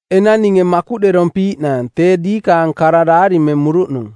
Enang ninge makuꞌderompiiꞌnaang tee diikaang kara daarimemuruꞌnung.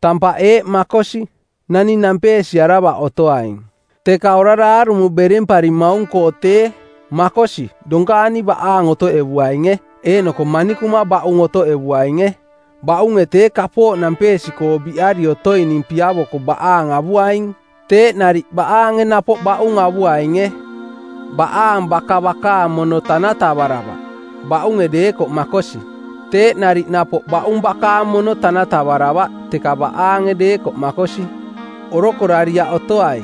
Tampaꞌ eeꞌ makosi: Naning nampeesiaravaꞌ otoaing. Teka orara aarumo beremparimaung-koo tee, makosi, donkaani baꞌaang otoꞌevuainge, eeꞌnoko manikuma baꞌung otoꞌevuainge. Baꞌunge tee kapooꞌ nampeesi-koo biꞌari otoining piavoko baꞌaang avuaing. Teeꞌ nariꞌ baꞌaange napoꞌ baꞌung avuainge. Baꞌaang baka bakaang mono tanatavaravaꞌ, baꞌunge deekoꞌ makosi. Teeꞌ nariꞌ napoꞌ baꞌung bakaang mono tanatavaravaꞌ, teka baꞌaange deekoꞌ makosi. Orokorariaꞌ otoai.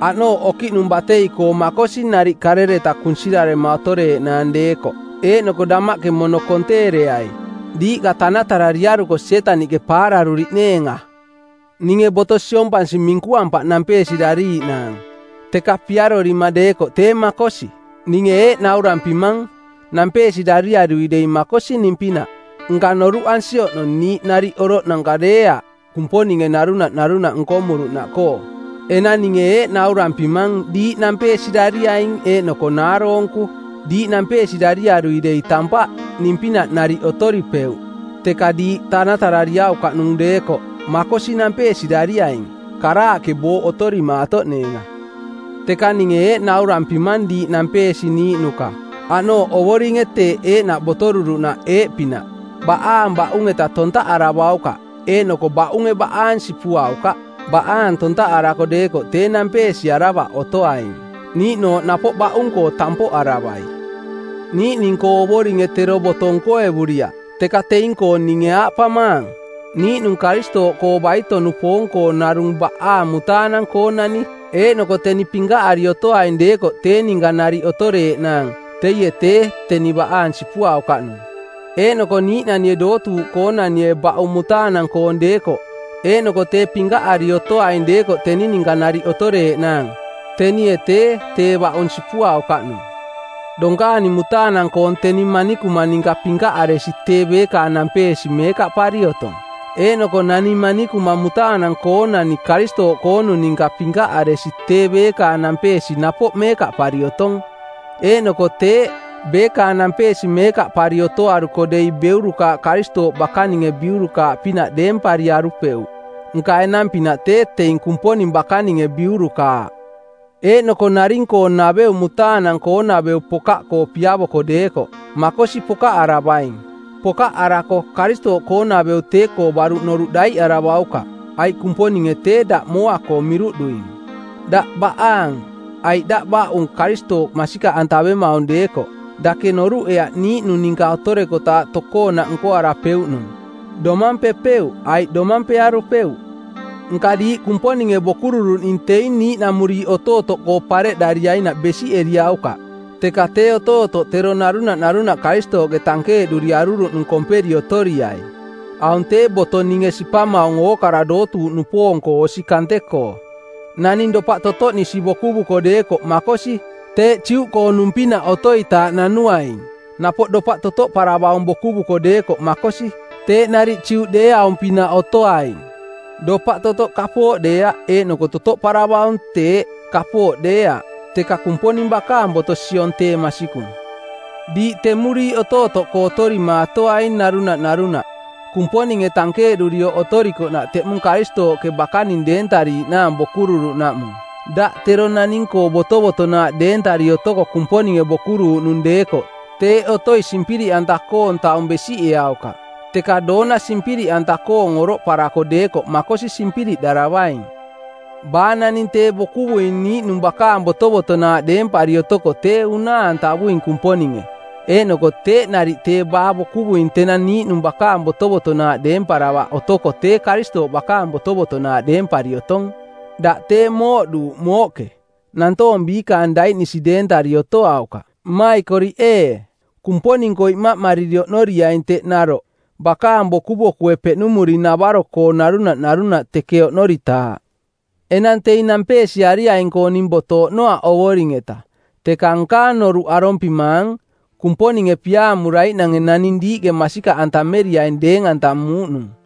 Aꞌnooꞌ okiꞌnung batei-koo makosi nariꞌ karereta kunsirarema otoreeꞌnaang deekoꞌ. Eeꞌnoko damaꞌke mono konteereai; diiꞌka tanatarariaruko Sietaniꞌke paararuriꞌneenga. Ninge boto siompansi minkuampaꞌ nampeesirariiꞌnaang, teka piarorima deekoꞌ tee makosi. Ninge eeꞌ naurampimang: Nampeesirariarui dei makosi ning-pinaꞌ, nka noruꞌansi oꞌnong niiꞌ nariꞌ oroꞌnanka deeaꞌ Kumponinge narunaꞌ narunaꞌ nkomuruꞌnaꞌkoo. Enang ninge eeꞌ naurampimang diiꞌ nampeesirariaing eeꞌnoko naaroonku: Diiꞌ nampeesirariarui dei tampaꞌ, ning-pinaꞌ nariꞌ otoripeuꞌ. Teka diiꞌka tanatarariaukaꞌnung deekoꞌ, makosi, nampeesirariaing, karaaꞌke booꞌ otorimaatoꞌneenga. Teka ninge eeꞌ naurampimang diiꞌ nampeesiniiꞌnuka, aꞌnooꞌ Ovoringe teeꞌ eeꞌnaꞌ botoruruꞌnaꞌ eeꞌpinaꞌ: Baꞌaang baꞌung-eta tontaꞌaravaukaꞌ, eeꞌnoko baꞌunge baꞌaang sipuaukaꞌ. Baꞌaang tontaꞌarara deekoꞌ tee nampeesiaravaꞌ otoaing, niiꞌnooꞌ napoꞌ baꞌung-koo tampoꞌaravai. Niiꞌning-koo Ovoringe tero boto nkoevuriaꞌ, teka teing-koo ninge aaꞌpamaang: Niiꞌnung Karistooꞌkoo baito-nupoong-koo narung baꞌaang mutaanang-koonani eeꞌnoko teni pinkaꞌari otoaing deekoꞌ tee ninka nariꞌ otoreeꞌnaang, teie tee, teni baꞌaang sipuaukaꞌnung. Eeꞌnoko niiꞌnanie dootuuꞌkoonanie baꞌung mutaanang-koong deekoꞌ eeꞌnoko tee pinkaꞌari otoaing deekoꞌ teni ninka nariꞌ otoreeꞌnaang, tenie tee, tee baꞌung sipuaukaꞌnung. Donkaani mutaanang-koong teni manikuma ninka pinkaꞌaresi tee beekaang nampeesi meekaꞌpari otong. Eeꞌnoko nani manikuma mutaanang-koonani Karistooꞌkoonung ninka pinkaꞌaresi tee beekaang nampeesi napoꞌ meekaꞌpari otong. Eeꞌkoo teeꞌ: Beekaang nampeesi meekaꞌpari otoaruko dei beurukaaꞌ Karistooꞌ bakaninge biurukaaꞌpinaꞌ deempariarupeuꞌ. Nka enang-pinaꞌ tee teing Kumponing bakaninge biurukaaꞌ. Eeꞌnoko naring-koo naveu mutaanang-koonaveu pokaꞌkoo piavoaing deekoꞌ, makosi, pokaꞌaravaing. Pokaꞌarako Karistooꞌkoonaveu tee-koo baruꞌ noruꞌ daiꞌaravaukaꞌ, aiꞌ Kumponinge tee daꞌ mooa-koo miruꞌduing. Daꞌ baꞌaang aiꞌ daꞌ baꞌung Karistooꞌ masikaꞌantavemaung deekoꞌ, dake noruꞌeaꞌ niiꞌnung ninka otorekotaaꞌ tokoonaꞌ nkoarapeuꞌnung: Domampepeuꞌ aiꞌ domampearupeuꞌ. Nka diiꞌ Kumponinge bokururuꞌning teing niiꞌnamuriiꞌ otootoꞌkoo pareꞌdariainaꞌ besiꞌeriaukaꞌ, teka tee otootoꞌ tero narunaꞌ narunaꞌ Karistooꞌke tankeeꞌduri aruruꞌnung komperi otoriai. Aung tee boto ninge sipamaung ookara dootuuꞌnupoong-koo osi kante-koo. Naning dopaꞌ totoꞌnisi bokuvuko deekoꞌ makosi, teeꞌ Juꞌkoonung-pinaꞌ otoitaaꞌ nanuaing. Napoꞌ dopaꞌ totoꞌparavaung bokuvuko deekoꞌ makosi, teeꞌ nariꞌ Juꞌdeeaung-pinaꞌ otoaing. Dopaꞌ totoꞌ kapooꞌ deeaꞌ, eeꞌnoko totoꞌparavaung teeꞌ, kapooꞌ deeaꞌ, teka Kumponing bakaang boto siong tee masikung. Diiꞌ temuriiꞌ otootoꞌkoo otorimaatoaing narunaꞌ narunaꞌ, Kumponinge tankeeꞌdurioꞌ otorikoꞌnaꞌ teꞌmung Karistooꞌke bakaning deentariiꞌnaang bokuruuꞌnaꞌmung. Daꞌ tero naning-koo botovotonaaꞌ deentari otoko Kumponinge bokuruuꞌnung deekoꞌ teeꞌ otoi simpiriꞌanta-koong taung besiꞌeaukaꞌ. Teka doona simpiriꞌanta-koong oroꞌparako deekoꞌ makosi simpiriꞌdaravaing. Baa naning tee bokuvuing niiꞌnung bakaang botovotonaaꞌ deempari otoko tee unaa-antavuing Kumponinge, eeꞌnoko teeꞌ nariꞌ tee baa bokuvuing tenang niiꞌnung bakaang botovotonaaꞌ deemparavaꞌ otoko tee Karistooꞌ bakaang botovotonaaꞌ deempari otong. Daꞌ tee mooꞌduuꞌ mooꞌke. Nantoong biikaang daiꞌnisi deentari otoaukaꞌ. Mmaikoriꞌ ee, Kumponing-koo imaꞌmariri oꞌnoriaing teꞌ naroꞌ bakaang bokubokue peꞌnumuring-navaro-koo narunaꞌ narunaꞌ teke oꞌnoritaaꞌ. Enang teing nampeesiariaing-koo ning boto oꞌnoaꞌ Ovoring-eta, teka nkaang noruꞌ arompimaang, Kumponinge piaamuraiꞌnange naning diiꞌke masikaꞌantameriaing deeng-antamuuꞌnung.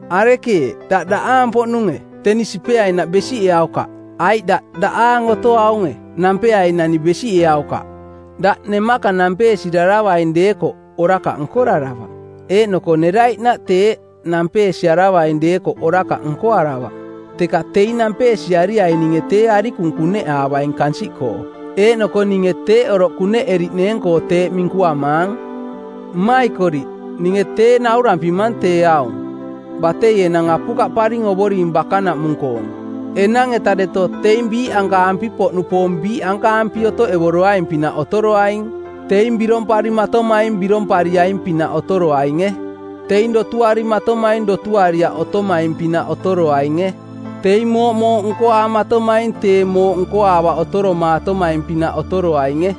Arekeeꞌ? Daꞌ daꞌaang-poꞌnunge? Teni sipeainaꞌ besiꞌeaukaꞌ. Aiꞌ daꞌ daꞌaang otoaunge? Nampeainani besiꞌeaukaꞌ. Daꞌ nemaka nampee-siraravaing deekoꞌ orakaꞌ nkoraravaꞌ. Eeꞌnoko neraiꞌnaꞌ teeꞌ, nampee-siaravaing deekoꞌ orakaꞌ nkoaravaꞌ. Teka teing nampeesiariaininge tee arikung kuneꞌaavaing kansiꞌkoo, eeꞌnoko ninge teeꞌ oroꞌ kuneꞌeriꞌneeng-koo teeꞌ minkuamaang. Mmaikoriꞌ, ninge tee naurampimang tee aung: Batei enang apukaꞌparing Ovoring bakanaꞌmung-koong. Enang-etaꞌ deto teing biiꞌankaampi-poꞌnupoong biiꞌankaampi otoꞌevoroaing-pinaꞌ otoroaing. Teing biromparimatomaing birompariaing-pinaꞌ otoroainge. Teing dotuarimatomaing dotuariaꞌ otomaing-pinaꞌ otoroainge. Teing mooꞌmooꞌ nkoaamatomaing tee mooꞌ nkoaavaꞌ otoromaatomaing-pinaꞌ otoroainge.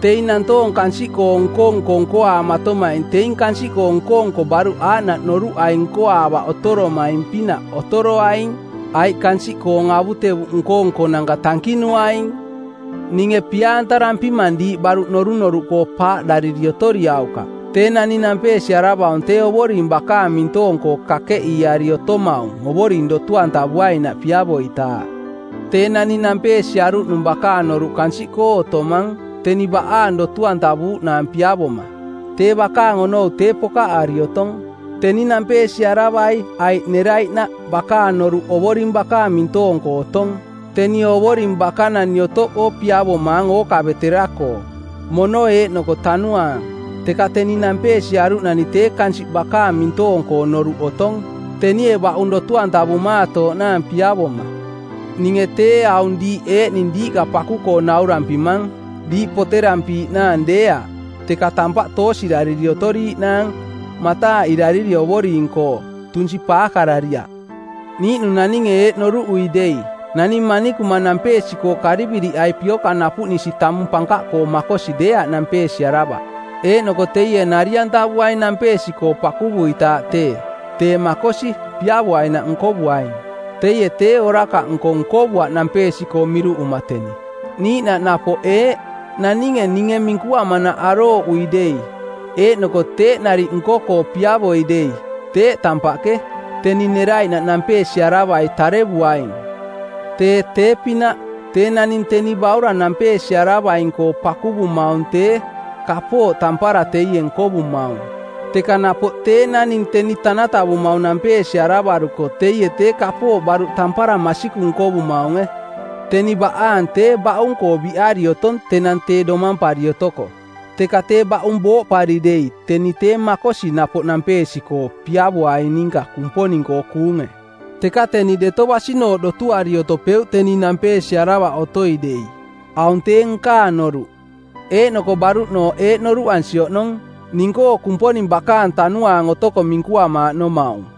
Teing nantoong kansiꞌkoong nko-nko nkoaamatomaing teing kansiꞌkoong nko-nko baruꞌ aaꞌnaꞌ noruꞌai nkoaavaꞌ otoromaing-pinaꞌ otoroaing, aiꞌ kansiꞌkoong avutevuꞌ nko-nkonanka tankinuaing. Ninge pia-antarampimang diiꞌ baruꞌ norunoruꞌkoo paaꞌdariri otoriaukaꞌ. Tee naning nampeesiaravaung tee Ovoring bakaang mintoong-koo kakeꞌiiari otomaung Ovoring dotu-antavuainaꞌ piavoitaaꞌ. Tee naning nampeesiaruꞌnung bakaang noruꞌ kansiꞌkoo otomang, teni baꞌaang dotu-antavuuꞌnaang piavoma. Tee bakaang onou tee pokaꞌari otong. Teni nampeesiaravai aiꞌ neraiꞌnaꞌ bakaang noruꞌ Ovoring bakaang mintoong-koo otong. Teni Ovoring bakanani otoꞌkoo piavomaang ookavetara-koo, mono eeꞌnoko tanuaang. Teka teni nampeesiaruꞌnani tee kansiꞌ bakaang mintoong-koo noruꞌ otong, tenie baꞌung dotu-antavumaatooꞌnaang piavoma. Ninge tee aung diiꞌ eeꞌning diiꞌka paku-koo naurampimang, diiꞌ poterampiiꞌnaang deeaꞌ, teka tampaꞌ toosirariri otoriiꞌnaang, mataaꞌirariri Ovoring-koo, tunsi paakarariaꞌ. Niiꞌnung naninge eeꞌ noruꞌui dei: nani manikuma nampeesi-koo kariviriꞌai piokang napuꞌnisi tamung pankaꞌkoo makosi deeaꞌ nampeesiaravaꞌ, eeꞌnoko teie nari-antavuaing nampeesi-koo pakuvuitaaꞌ tee, tee makosi, piavoainaꞌ nkovuaing. Teie tee orakaꞌnko nkovuaꞌ nampeesi-koo miruꞌuma teni. Niiꞌnaꞌ napoꞌ eeꞌ: naninge ninge minkuamanaꞌ arooꞌui dei, eeꞌnoko teeꞌ nariꞌ nko-koo piavoi dei, teeꞌ tampaꞌke, teni neraiꞌnaꞌ nampeesiaravai tarevuaing. Tee tee-pinaꞌ: Tee naning teni baurang nampeesiaravaing-koo pakuvumaung tee, kapooꞌ tampara teie nkovumaung; teka napoꞌ tee naning teni tanatavumaung nampeesiaravaruko teie, tee kapooꞌ baruꞌ tampara masikung nkovumaunge. Teni baꞌaang tee baꞌung-koo biꞌari otong tenang tee domampari otoko, teka tee baꞌung booꞌpari dei teni tee makosi napoꞌ nampeesi-koo piavoaing ninka Kumponing-koo kuunge. Teka teni deto basinooꞌ dotuari otopeuꞌ teni nampeesiaravaꞌ otoi dei. Aung tee nkaang noruꞌ, eeꞌnoko baruꞌnooꞌ eeꞌ noruꞌansi oꞌnong: Ning-koo Kumponing bakaang Tanuaang otoko minkuamaaꞌnomaung.